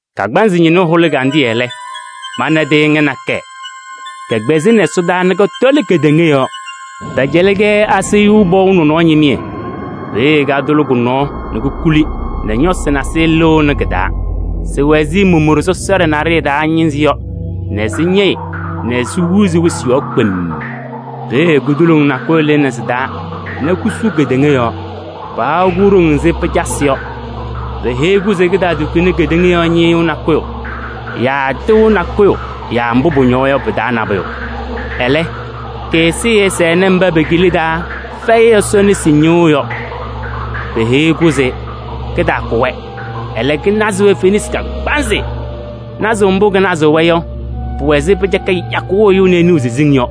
Kagbaanzɩ ñɩnʋ hʋlɩ ɛgandɩyɛ lɛ, mana tɩɩŋa nakɛyɛ, kɛkpɛzɩnɩ ɛsɔdaa nɛ kɔtɔlɩ kedeŋa yɔɔ. Pɛcɛlɩ-kɛ asayʋʋ pɔʋ nɔnɔɔ ñɩmɩyɛ. Peeye katʋlɩ kʋ-nɔɔ nɛ kokuli nɛ ñɔsɩ nasɩyɩ lɩɣnɩ kɩ-taa. Sɩwɛ ɛzɩ momoɖe sɔsɔɖɛ naɖɩyɛ taa ñɩnzɩ yɔ nɛ sɩñɛyɩ nɛ sihuuzi wɩsɩ yɔɔ kpemm. Peeye kudoloŋ nakʋyʋ lɩnɩ sɩ-taa nɛ kusu kedeŋa yɔɔ. Paha-kʋ ɖoŋ ɛzɩ pɩcasɩ yɔ. Peheyi-kʋ se kɩtaatukuni kedeŋa yɔɔ ñɩyʋʋ nakʋyʋ yaa tɩʋ nakʋyʋ yaa mbʋ pʋñɔwa yɔ, pɩ-taa nabʋyʋ. Ɛlɛ, kɩ-ɛzɩyɛ ɛsɛnɩ mba pe-kila taa fɛyɩ Ɛsɔ nesi ñɩɣʋ yɔ. Peheyi-kʋ se kɩtaakʋ-wɛ, ɛlɛ, kɩnazɩ-wɛ fenasɩ kagbaanzɩ. Nazʋʋ mbʋ kɩnazɩɣ-wɛ yɔ, pʋwɛ ɛzɩ pɩcaka yakʋʋ ɛyʋ nɛ ɛnɩɣ siziŋ yɔ.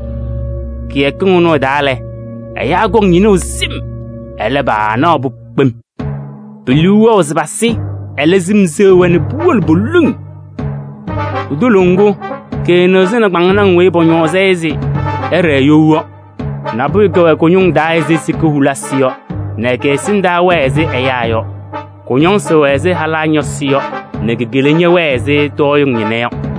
Kɩyakɩŋ ɩnʋ ɩ-taa lɛ, ɛyaa kɔŋ ñɩnʋʋ sɩm, ɛlɛ, paanaɣ-pʋ kpem. Pe-liu wɛɣ se pasɩ, ɛlɛ, sɩm seɣ-wɛ nɛ puwolo poliŋ. Kutoloŋ ŋgʋ, kɩnɩɣzɩnɩ kpaŋnaŋ weyi pɔñɔɔzɩ-ɩ se ɩɖɛɛ you yɔ. Nabʋyʋ kɛwɛ kʋ-ñʋŋ taa ɛzɩ sika hulisi yɔ nɛ kɩ-ɛsɩndaa wɛɛ ɛzɩ ɛyaa yɔ. Kʋ-ñɔsɩ wɛ ɛzɩ halaa ñɔsɩ yɔ nɛ ki-kela ñɛwɛɛ ɛzɩ tɔɔyɩŋ ñɩna yɔ.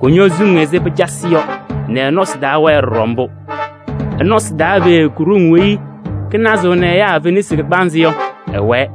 Kʋñɔ suŋ ɛzɩ pɩcasɩ yɔ nɛ ɩ-nɔsɩ taa wɛɛ ɖɔɖɔ mbʋ. Ɩ-nɔsɩ taa peeye ku-ɖoŋ weyi kɩnazɩɣnɩ ɛyaa fenasɩ kagbaanzɩ yɔ, ɛwɛɛ.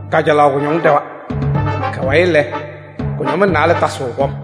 Kajalaɣ kʋñɔŋ ɖɛwa. Kʋ-wayɩ lɛ, kʋñɔmɩŋ naalɛ tasɩɣ kɔm.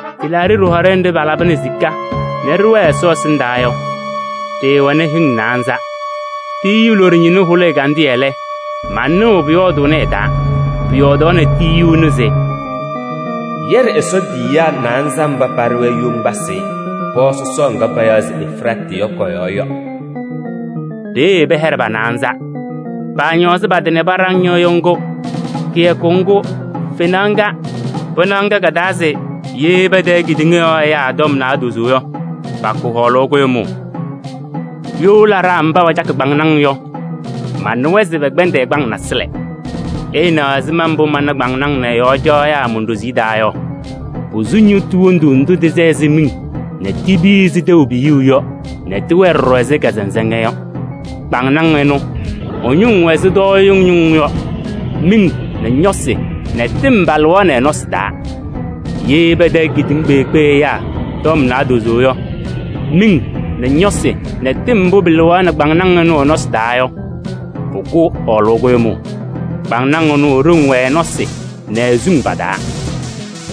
Tɩlaaɖɩ ɖɩhɔɖɛ nɖɩ palabɩnɩ sika nɛ ɖɩwɛɛ Ɛsɔ ɛsɩndaa yɔ, ɖɩɩwɛnɩ hɩŋ naanza. Tiyiyu loɖo ñɩnʋ hʋlɩ ɛgandɩyɛ lɛ, manɩɣ pʋyɔɔdʋʋnɩ ɩ-taa. Pʋyɔɔdaɣnɩ tiyiyu ɛnʋ se: “Yɛɖɩ Ɛsɔ tiyiyaa naanza mba paɖɩ-wɛ yoŋgbasɩ pɔɔ sɔsɔɔ ŋga payaɣ se Efiraatɩ yɔ kɔ-yɔɔ yɔ.” Peeye pɛhɛɖɩ pa-naanza. Paañɔɔzɩ pa-tɩ nɛ paɖaŋ ñɩɣyʋʋ ŋgʋ, kɩyakʋ ŋgʋ, fenaɣ ŋga, pɩnaɣ ŋga ka-taa se ye patayɩ kedeŋa yɔɔ ɛyaa tɔm naadozo yɔ, pakʋ hɔɔlʋʋ kʋɖʋmʋʋ. You laɖaa mba pacakɩ kpaŋnaŋ yɔ, manɩwa se pɛkpɛndɩ ɛgbaŋ nasɩlɛ. Ɩɩnaɣ ɛzɩma mbʋ mana kpaŋnaŋ nɛ ɩ-yɔɔ caɣyaa mon-ɖoziye taa yɔ: posu ñɩɣtʋ wondu ndʋ tɩsɛ ɛzɩ miŋ nɛ tipiyi ɛzɩ tɛʋ piyuu yɔ nɛ tɩwɛɛ ɖɔɖɔ ɛzɩ kazɩnzɩŋa yɔ. Kpaŋnaŋ ɩnʋ, ɩ-ñʋŋ wɛ ɛzɩ tɔɔyɩŋ ñʋŋ yɔ, miŋ nɛ ñɔsɩ nɛ tɩm palɩɣaɣnɩ ɩ-nɔsɩ taa. Ye patayɩ kedeŋa kpeekpe ɛyaa tɔm naadozo yɔ, miŋ nɛ ñɔsɩ nɛ tɩm mbʋ pɩlɩɣaɣnɩ kpaŋnaŋ ɩnʋ ɩ-nɔsɩ taa yɔ, pʋkʋ hɔɔlʋʋ kʋɖʋmʋʋ. Kpaŋnaŋ ɩnʋ, i-ɖoŋ wɛ ɩ-nɔsɩ nɛ i-suŋ pa-taa.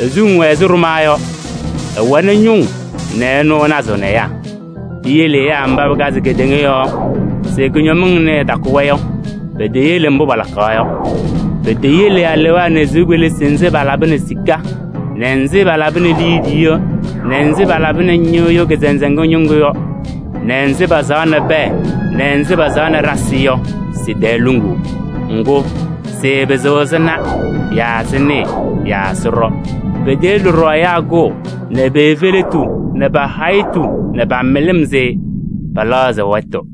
I-suŋ wɛ ɛzɩ ɖʋmaa yɔ: ɩwɛnɩ ñʋŋ nɛ ɩnʋ ɩnazɩɣnɩ ɛyaa. Piyele ɛyaa mba pɩkazɩ kedeŋa yɔɔ se kʋñɔmɩŋ ɩnʋ ɩtakʋ-wɛ yɔ, peteyele mbʋ palaɣkaɣ yɔ. Peteyele alewaa nɛ sɩʋ kpelisi nzɩ palabɩnɩ sika nɛ nzɩ palabɩnɩ liidiye nɛ nzɩ palabɩnɩ ñɩɣyʋʋ kazɩnzɩŋa ñɩŋgʋ yɔ nɛ nzɩ pasaɣnɩ pɛɛ nɛ nzɩ pasaɣnɩ ɖasɩ yɔ, sɩ-tɛɛ luŋuu. Ŋgʋ, sɩɩpɩzɩɣ sɩna yaa sɩnɩɩ yaa sɩɖɔ. Peteyele ɖɔɖɔ ɛyaa kʋʋ, nɛ pe-efeletu nɛ pa-hayitu nɛ pa-mɩlɩm se pɛlɛɣzɩ wɛtʋ.